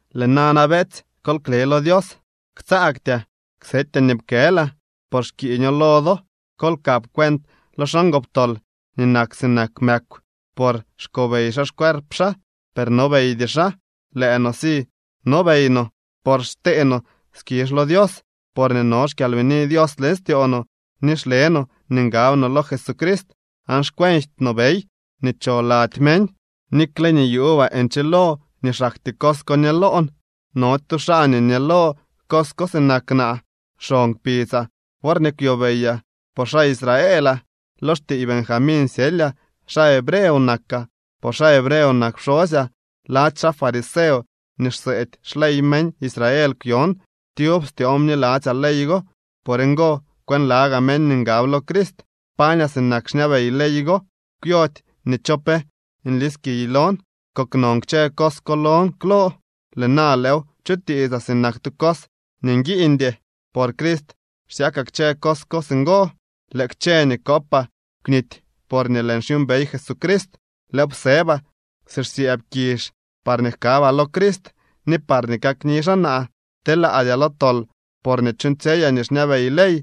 Lëë nana, beetsy, kol kle lo Dios. Ktsaagtyaa ksetyaa nii pkëlaa, por xkiiño lo do. Kol kap cuent lo xaa ngoptol nii nak sinak mëkw. Por xkobey xaa xcuerp xaa. Per nobeydy xaa. Lëë no si nobey no, por xtee no skizh lo Dios porñee no xkyalbini Dios leñ styoo no, ni xle no nii ngab no lo Jesucrist, aan xkwenjty no bey nii cho lady meñ. Nikle nii yuubaa nchilo nii xaktyee cos ko ñëlon, nody stu xaa nii ñëlo cos ko sinak naa. Xon kpidzaa worñee kwyobeyaa, por xaa Israelaa. Lo xtiiy Benjamín syelyaa. Xaa hebreo nakaa, por xaa hebreo nak pxosyaa. Lady xaa fariseo nii xseedy xley meñ Israel kwyon. Tyub styoon bniladzyaa ley go. Por ngo kwënlagaa meñ nii ngab lo Crist. Pañaa sinak xñabey ley go. Kwyody nii cho pe nliskiy lon. Koknon kchë cos ko lon klo. Lëë na lëëw chutiitsaa sinak tu cos nii nguiiñdy. Por Crist xsyakaa kchë cos ko singo. Lëë kchë nii kopaa kwnity, porñee lëën xyuumbey Jesucrist. Lëëw psëbaa si xsyëëb kizh, parñee jkabaa lo Crist ni parñee kakni xaa naa. Telaadyaa lo tol porñee chuuñtsyeyaa nii xñabey ley,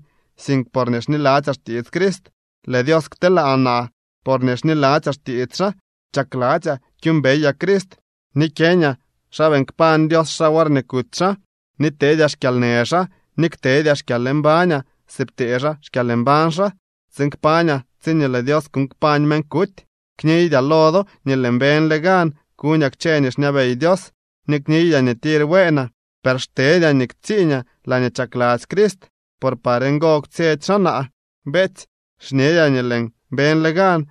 sink porñee xniladzyaa xtiits Crist. Lëë Dios kteelaa naa porñee xniladzyaa xtiits xaa. Chakladzyaa kyuumbeyaa Crist, ni kyeeñaa xa beeñ kpañ Dios xaa worñee kuty xaa. Ni teedyaa xkyalnë xaa ni ktedyaa xkyalmbañaa si ptee xaa xkyalmbañ xaa, tsiin kpañaa tsiñee lëë Dios kuuñ kpañ meñ kuty. Kniydyaa lo do nii lëën beñle gan kuñaa kchë nii xñabey Dios, ni kniydyaa nii tir bueenaa, per xtedyaa nii ktsiiñaa laañee chakladzy Crist por par ngo kwtsyetsy xaa naa. Beetsy, xñedyaa nii lëën beñle gan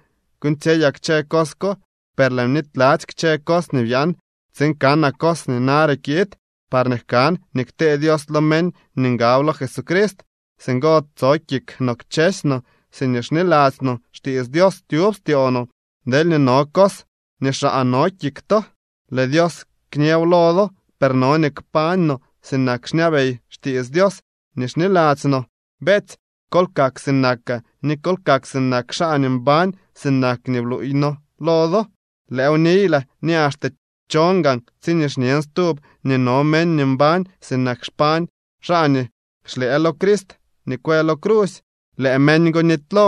kuuñtsyeyaa kchë cos ko, per lëën bnityladzy kchë cos nii byaan tsiin kanaa cos nii nare kiid, parñee jkan nii ktee Dios lo meñ nii ngab lo Jesucrist. Singo tso kik no kchësy no siñee xniladzy no xtiits Dios tyub styoo no. Deelñee no cos nii xaa no kik to, lëë Dios kñëw lo do. Per no nii kpañ no sinak xñabey xtiits Dios nii xniladzy no. Beetsy, kol kak sinakaa, ni kol kak sinak xaa nii mbañ sinak nii bluuy noo lo do. Lëëw niylaa ni axte chon gaan tsiñee xñen stub nii no meñ nii mbañ sinak xpañ xaa nii xlëë lo Crist nii kwë lo crusy. Lëë meñ go nitylo.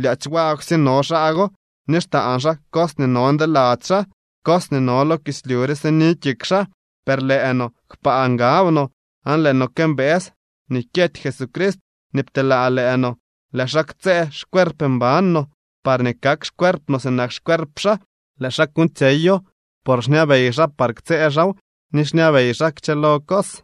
Lyaadzy wagwsye no xaa go, ni xtaan xaa cos nii no ndeladzy xaa. Cos nii no lo kislyu re sini kik xaa. Per lëë no, kpaa ngab no, aan lëë no këmbëës nii kyety Jesucrist nii pteelaa lëë no. Lëë xaa ktsëë xcuerp mban no, parñee kak xcuerp no sinak xcuerp xaa. Lëë xaa kuuñtsyeyo por xñabey xaa par ktsëë xaaw ni xñabey xaa kchëlo cos.